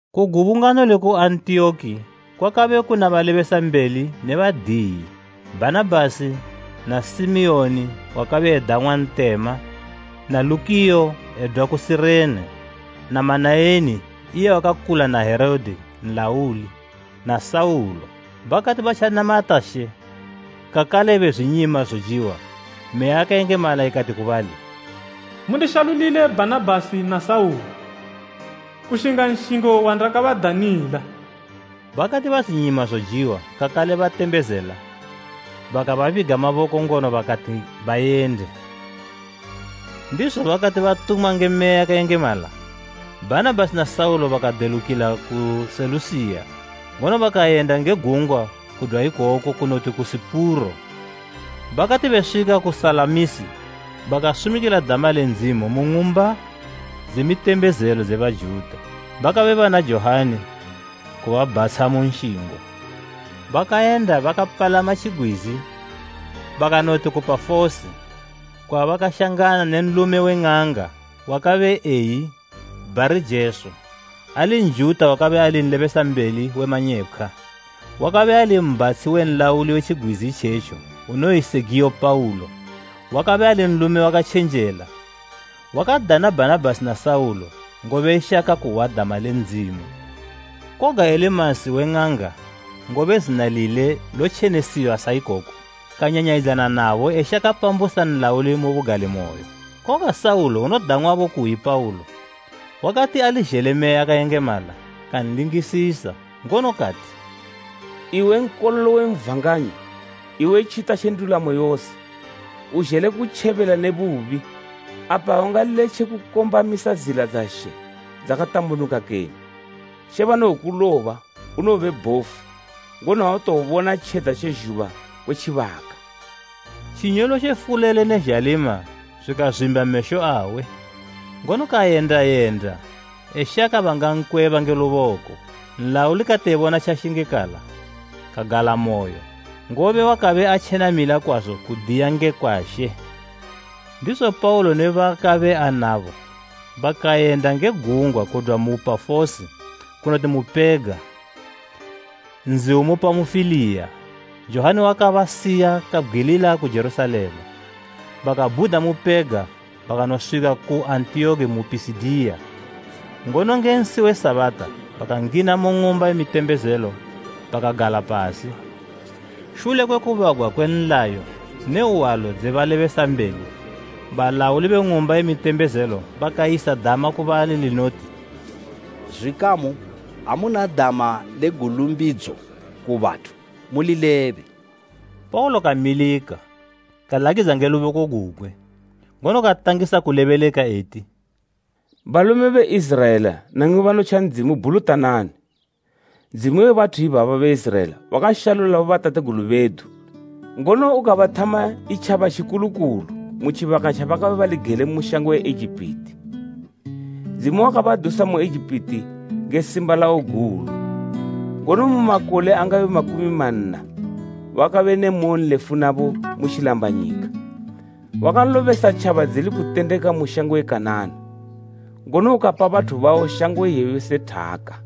Ku gubungano liku Antiyoki kwakabe kuna balebesambeli ne badiyi, Bhanabhasi, na Simiyoni wakabe edang'wa Ntema na Lukiyo edwa ku Sirene, na Manaeni iye wakakula na Herode nlauli, na Saulo. Bakati batjanamata She kakale bezwinyima zojiwa, Meya yakayengemala ikati ku bali, “Mundishalulile Bhanabhasi na Saulo kushinga nshingo wandakabadanila.” Bakati bazwinyima zojiwa kakale batembezela, bakababiga maboko ngono bakati bayende. Ndizo bakati batumwa nge Meya yakayengemala, Bhanabhasi na Saulo bakadelukila ku Selusiya, ngono bakayenda nge gungwa kudwa ikoko kunoti ku Sipuro. Bakati beswika ku Salamisi, bakasumikila dama le Ndzimu mu ng'umba dze mitembezelo dze Bajuta. Bakabe bana Johani kubabhatsha mu nshingo. Bakayenda bakapalama tjigwizi bakanoti ku Pafosi kwabakashangana ne nlume we ng'anga wakabe eyi Bharijesu, ali Njuta wakabe ali nlebesambeli we manyepkhwa, wakabe ali mbhatshi we nlauli we tjigwizi itjetjo unoyi Segiyo Paulo, wakabe ali nlume wakatjenjela. Wakadana Bhanabhasi na Saulo, ngobe eshaka kuhwa dama le Ndzimu. Koga Elimasi we ng'anga (ngobe zina lile lotjenesiwa sa ikoko), kanyanyayidzana nabo eshaka pambusa nlauli mu bugalimoyo. Koga Saulo unodang'wabo kuyi Paulo, wakati ali zhele Meya yakayengemala, kanlingisisa, ngono kati, “Iwe nkololo wa Satani, iwe tjita tje ndulamo yose. Uzhele kutjebela ne bubi, apa aungaletje kukombamisa zila dza She dzakatambunuka kene? She banowokuloba, unowobe bhofu, ngono autowobona tjedza tje zhuba kwe tjibaka.” Tjinyolotjo fulele ne zhalima zwikazwimba mesho awe, ngono kayenda yenda eshaka bangankweba nge luboko. Nlauli kati ebona tjashingikala, kagalamoyo, ngobe wakabe atjenamila kwazo kudiya ngekwa She. Ndizo Paulo ne baakabe anabo bakayenda nge gungwa kudwa mu Pafosi kunoti mu Pega, nzi umu Pamufiliya, Johani wakabasiya kabgwilila ku Jerusalema. Bakabhuda mu Pega bakanoswika ku Antiyoki mu Pisidiya, ngono nge nsi we Sabata bakangina mu ng'umba ye mitembezelo bakagala pasi. Shule kwe kubagwa kwe nlayo ne hwalo dze balebesambeli, balauli be ng'umba ye mitembezelo bakayisa dama ku bali linoti “Zwikamu, amuna dama le gulumbidzo ku bathu mulilebe.” Paulo kamilika, kalakidza nge luboko gugwe, ngono katangisa kulebeleka eti: “Balume be Iziraela namwi banotja Ndzimu bhulutanani. Ndzimu we bathu ibaba be Iziraela wakashalula bobatategulu bedu ngono ukabathama itjaba tjikulu kulu mu tjibaka tjabakabe bali gele mu shango ye Egipiti. Ndzimu wakabadusa mu Egipiti nge simba lawo gulu, ngono mu makole angabe makumi manna wakabe ne moyonlefu nabo mu tjilambanyika. Wakalobesa tjaba dzili kutendeka mu shango ye Kanana, ngono ukapa bathu bawo shango iyeyo se thaka.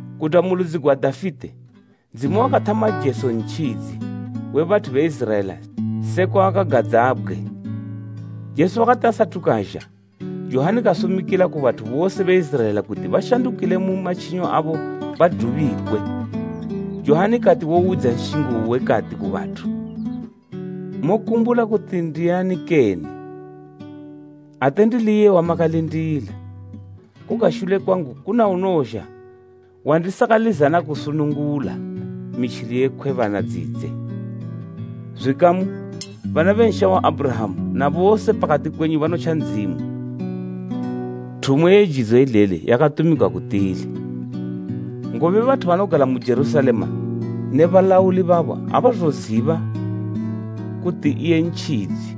Kudwa mu ludzi gwa Dafite, Ndzimu wakathama Jesu Ntjidzi we bathu be Iziraela sekwa wakagadzabgwe. Jesu wakati asathu kazha, Johani kasumikila ku bathu bose be Iziraela kuti bashandukile matjinyo abo badubikwe. Johani kati wowidza nshingo uwe, kati ku bathu, ‘Mokumbula kuti ndiani kene? Ate ndili iye wamakalindila. Koga shule kwangu kuna unowozha wandisakalizana kusunungula mitjili ye khwebana dzidze.’ “Zwikamu, bana be nsha wa Abhurahama, na bose pakati kwenyu banotja Ndzimu, thumo ye jidzo ileli yakatumigwa ku tili! Ngobe bathu banogala mu Jerusalema ne balauli babo abazoziba kuti iye Ntjidzi,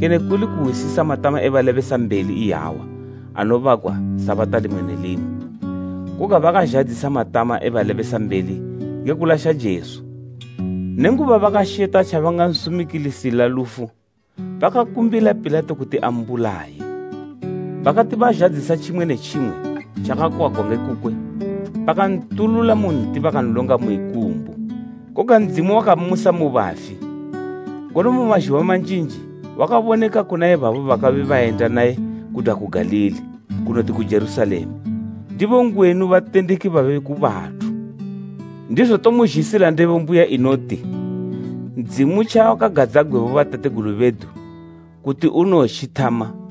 kene kuli kuhwisisa matama e balebesambeli iyawa anobagwa Sabata limwe ne limwe. Koga bakazhadzisa matama e balebesambeli nge kulasha Jesu. Nenguba bakasheta tjabangansumikilisila lufu, bakakumbila Pilato kuti ambulaye. Bakati bazhadzisa tjimwe ne tjimwe tjakakwagwa nge kukwe bakantulula mu nti bakanlonga mu ikumbu. Koga Ndzimu wakammusa mu bafi, ngono mu mazhuba manjinji wakaboneka kuna ibabo bakabe bayenda naye kudwa ku Galili kunoti ku Jerusalema. Ndibo ngwenu batendeki babe ku bathu. Ndizo tomuzhisila ndebo mbuya kumuli inoti, Ndzimu tjawakagadzabgwe bobatategulu bedu kuti unowotjithama,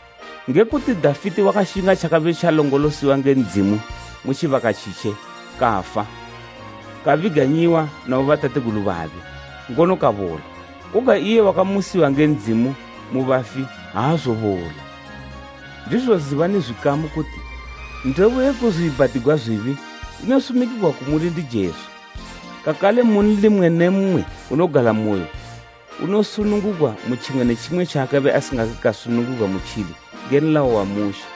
“Nge kuti Dafite wakashinga tjakabe tjalongolosiwa nge Ndzimu mu tjibaka tjitje kafa, kabiganyiwa na bobatategulu babe, ngono kabola. Koga iye wakamusiwa nge Ndzimu mu bafi aazobola. Ndizo zibani zwikamu kuti ndebo ye kuzwiibhatigwa zwibi inosumikigwa kumuli ndi Jesu kakale munli mmwe ne mmwe unogalamoyo unosunungugwa mu tjimwe ne tjimwe tjaakabe asingake kasunungugwa mutjili nge nlayo wa Mushe.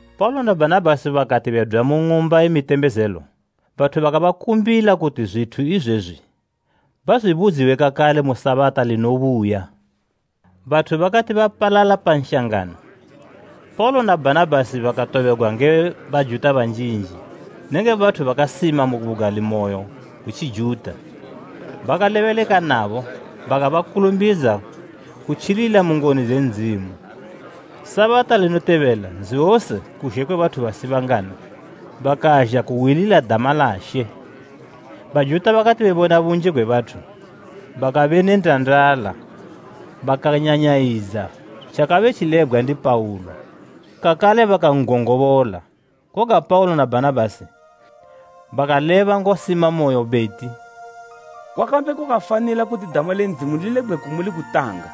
Paulo na Bhanabhasi bakati bedwa mu ng'umba ye mitembezelo, bathu bakabakumbila kuti zwithu izwezwi bazwibudziwe kakale mu Sabata linobuya. Bathu bakati bapalala pa nshangano, Paulo na Bhanabhasi bakatobegwa nge Bajuta banjinji nenge bathu bakasima mu bugalimoyo gwe Tjijuta. Bakalebeleka nabo bakabakulumbidza kutjilila mu ngoni dze Ndzimu. Sabata linotobela nzi wose kuzhe kwe bathu basibangana bakazha kuhwilila dama la She. Bajuta bakati bebona bunji gwe bathu bakabe ne ndandala, bakanyanyayidza tjakabe tjilebgwa ndi Paulo, kakale bakan'gongobola. Koga Paulo na Bhanabhasi bakaleba ngosimamoyo beti, “Kwakabe kwakafanila kuti dama le Ndzimu lilebgwe kumuli kutanga.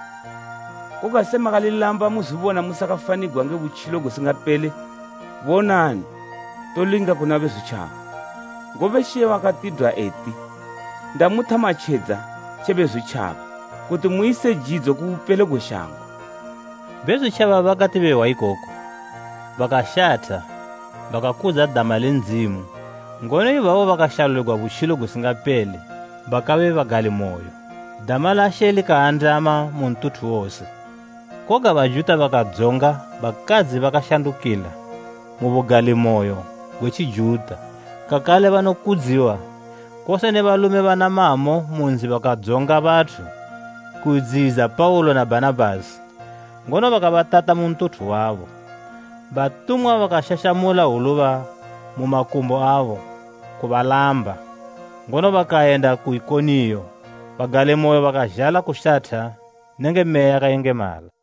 Koga se makalilamba muzwibona musakafanigwa nge butjilo gusingapele, bonani tolinga kuna Bezwitjaba. Ngobe She wakatidwa eti, “ ‘Ndamuthama tjedza tje Bezwitjaba, kuti muyise jidzo ku bupelo gwe shango.’” Bezwitjaba bakati behwa ikoku, bakashatha bakakudza dama le Ndzimu ngono ibabo bakashaluligwa butjilo gusingapele bakabe bagalimoyo. Dama la She likaandama mu ntuthu wose. Koga Bajuta bakadzonga bakadzi bakashandukila mu bugalimoyo gwe Tjijuta kakale banokudziwa kose ne balume bana mamo mu nzi bakadzonga bathu kudziyidza Paulo na Bhanabhasi, ngono bakabatata mu ntuthu wabo. Batumwa bakashashamula hwuluba mu makumbo abo kubalamba, ngono bakayenda ku Ikoniyo. Bagalimoyo bakazhala kushatha nenge Meya yakayengemala.